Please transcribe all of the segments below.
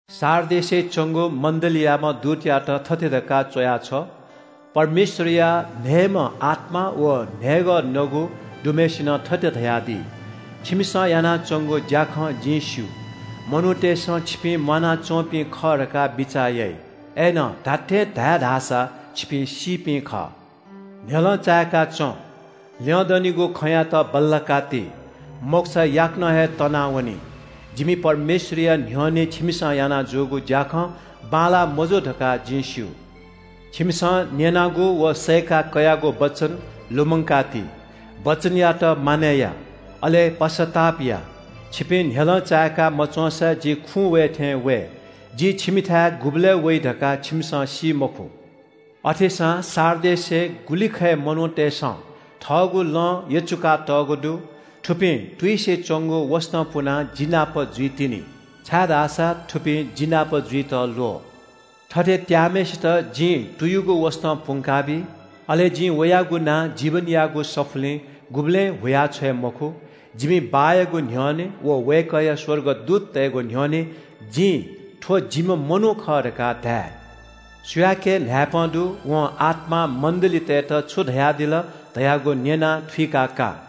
“सार्डिसय् च्‍वंगु मण्‍डलीयाम्‍ह दूतयात थथे धकाः च्‍वया छ्व – परमेश्‍वरया न्‍हय्‌म्‍ह आत्‍मा व न्‍हय्‌गः नगु दुम्‍हय्‌सिनं थथे धयादी – “छिमिसं यानाच्‍वंगु ज्‍याखँ जिं स्‍यू। मनूतय्‌सं छिपिं म्‍वानाच्‍वंपिं खः धकाः बिचाः याइ, अय्‌नं धात्‍थें धाये धाःसा छिपिं सीपिं खः। न्‍ह्यलं चायेका च्‍वँ, ल्‍यंदनिगु खँयात बल्‍लाका ति। मखुसा याकनं हे तनावनी। जिमि परमेश्‍वरया न्‍ह्यःने छिमिसं याना जूगु ज्‍याखँ बांलाः मजू धकाः जिं स्‍यू। छिमिसं न्‍यनागु व सयेका कयागु वचन लुमंका ति। वचनयात मानय् या, अले पश्‍चाताप या। छिपिं न्‍ह्यलं चायेका मच्‍वंसा जि खुँ वः थें वये। जि छिमिथाय् गुबलय् वइ धकाः छिमिसं सी मखु। “अथेसां सार्डिसय् गुलिखय् मनूतय्‌सं थःगु लं यचुकातःगु दु। थुपिं तुइसे च्‍वंगु वसतं पुनाः जि नाप जुइतिनि, छाय्‌धाःसा थुपिं जि नाप जुइत ल्‍वः। थथे त्‍याःम्‍हय्‌सित जिं तुयुगु वसतं पुंकाबी। अले जिं वयागु नां जीवनयागु सफुलिं गुबलें हुयाछ्वये मखु। जिमि बाःयागु न्‍ह्यःने व वय्‌कःया स्‍वर्गदूततय्‌गु न्‍ह्यःने जिं थ्‍व जिम्‍ह मनू खः धकाः धाये। “सुयाके न्‍हाय्‌पं दु, वं आत्‍मां मण्‍डलीतय्‌त छु धयादिल धयागु न्‍यनाः थुइकाः का।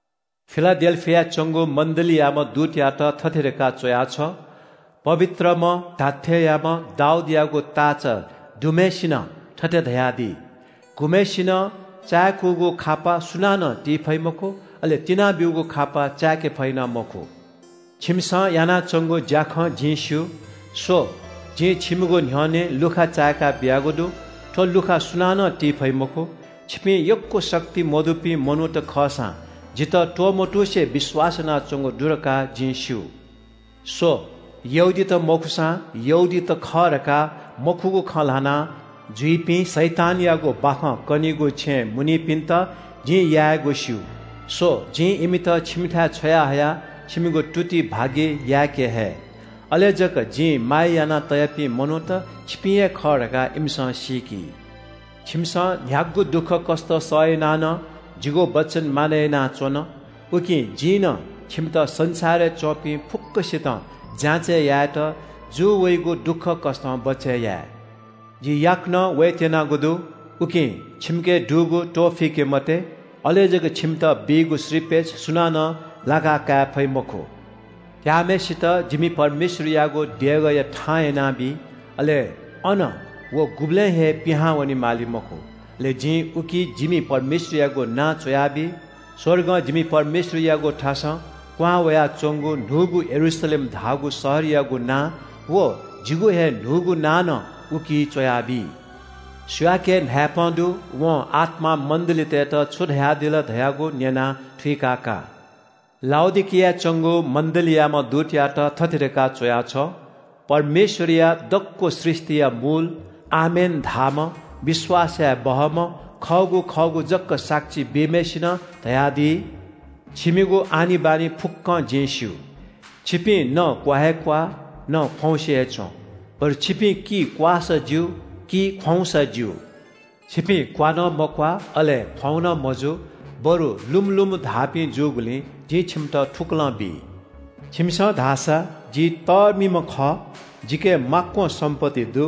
“फिलाडेल्‍फियाय् च्‍वंगु मण्‍डलीयाम्‍ह दूतयात थथे धकाः च्‍वया छ्व – “पवित्रम्‍ह, धात्‍थेंयाम्‍ह, दाऊदयागु ताःचा दुम्‍हय्‌सिनं थथे धयादी – गुम्‍हय्‌सिनं चाय्‌कूगु खापा सुनानं ति फइ मखु, अले तिनाब्‍यूगु खापा चाय्‌के फइ नं मखु। “छिमिसं यानाच्‍वंगु ज्‍याखँ जिं स्‍यू। स्‍व, जिं छिमिगु न्‍ह्यःने लुखा चाय्‌का बियागु दु। थ्‍व लुखा सुनानं ति फइ मखु। छिपिं यक्‍व शक्ति मदुपिं मनूत खःसां जितः त्‍वमतुसे विश्‍वास यानाच्‍वंगु दु धकाः जिं स्‍यू। स्‍व, यहूदीत मखुसां यहूदीत खः धकाः मखुगु खँ ल्‍हानाजुइपिं शैतानयागु बाखं कनीगु छेँय् मुनिपिन्‍त जिं यायेगु स्‍यू। स्‍व, जिं इमित छिमिथाय् छ्वयाहयाः छिमिगु तुति भागि याकेहये। अले जक जिं माया याना तयापिं मनूत छिपिं हे खः धकाः इमिसं सीकी। “छिमिसं न्‍ह्यागु दुःखकष्‍ट सहयाना नं जिगु वचन मानय् यानाच्‍वन। उकिं जिं नं छिमित संसारय् च्‍वंपिं फुक्‍कसितं जाँचय् यायेत जू वइगु दुःखकष्‍टं बचय् याये। जि याकनं वयेत्‍यनागु दु, उकिं छिमिके दुगु त्‍वःफिके मते। अले जक छिमित बीगु श्रीपेच सुनानं लाकाकाये फइ मखु। त्‍याःम्‍हय्‌सित जिमि परमेश्‍वरयागु देगःया थां यानाबी। अले अनं व गुबलें हे पिहां वनेमाली मखु। अले जिं उकी जिमि परमेश्‍वरयागु नां च्‍वयाबी, स्‍वर्गं जिमि परमेश्‍वरयागु थासं क्‍वहां वयाच्‍वंगु न्‍हूगु यरूशलेम धाःगु शहरयागु नां व जिगु हे न्‍हूगु नां नं उकी च्‍वयाबी। “सुयाके न्‍हाय्‌पं दु, वं आत्‍मां मण्‍डलीतय्‌त छु धयादिल धयागु न्‍यनाः थुइकाः का। “लाउडिकियाय् च्‍वंगु मण्‍डलीयाम्‍ह दूतयात थथे धकाः च्‍वया छ्व – परमेश्‍वरया दक्‍व सृष्‍टिया शासक, आमेन धाःम्‍ह, विश्‍वास याये बहःम्‍ह, खःगु खःगु जक साक्षी बीम्‍हय्‌सिनं धयादी। “छिमिगु आनिबानि फुक्‍कं जिं स्‍यू। छिपिं न क्‍वा हे क्‍वाः, न ख्‍वाउँसे हे च्‍वं, बरु छिपिं कि क्‍वाःसा ज्‍यू कि ख्‍वाउँसा ज्‍यू। छिपिं क्‍वा नं मक्‍वाः अले ख्‍वाउँ नं मजू, बरु लुमु लुमु धाःपिं जूगुलिं जिं छिमित थुकलं बी। छिमिसं धाःसा ‘जि तःमिम्‍ह खः, जिके माक्‍वं सम्‍पत्ति दु,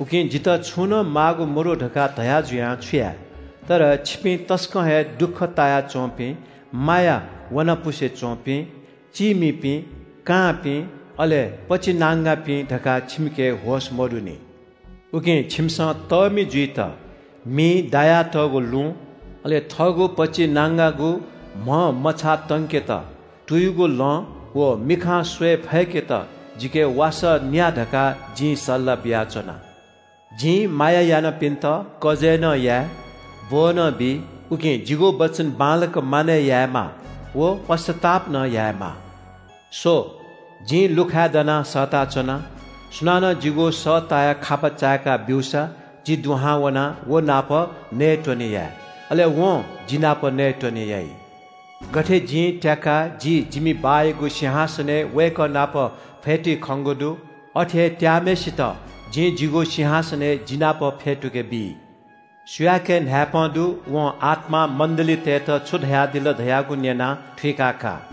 उकिं जितः छुं नं माःगु मदु’ धकाः धया जुयां छु याये? तर छिपिं तसकं हे दुःख ताया च्‍वंपिं, माया वनापुसे च्‍वंपिं, चीमिपिं, कांपिं, अले पचिनांगापिं धकाः छिमिके होश मदुनि। उकिं छिमिसं तःमि जुइत मिइ दायातःगु लुँ, अले थःगु पचिनांगागु म्‍हया मछाः तंकेत तुयुगु लं, व मिखाय् तयेत मलम जिके न्‍या धकाः जिं सल्‍लाह बियाच्‍वना। जिं माया यानापिन्‍त कजय् नं याये, ब्‍वः नं बी, उकिं जिगु वचन बांलाक मानय् यायेमाः व पश्‍चाताप नं यायेमाः। “स्‍व, जिं लुखाय् दनाः सःताच्‍वना। सुनानं जिगु सः तायाः खापा चाय्‌का ब्‍यूसा जि दुहां वनाः व नाप नयेत्‍वने याये। अले वं जि नाप नयेत्‍वने याइ। गथे जिं त्‍याकाः जि जिमि बाःयागु सिंहासनय् वय्‌कः नाप फ्‍यतुइ खंगु दु, अथे हे त्‍याम्‍हय्‌सित जिं जिगु सिंहासनय् जि नाप फ्‍यतुके बी। “सुयाके न्‍हाय्‌पं दु, वं आत्‍मां मण्‍डलीतय्‌त छु धयादिल धयागु न्‍यनाः थुइकाः का।”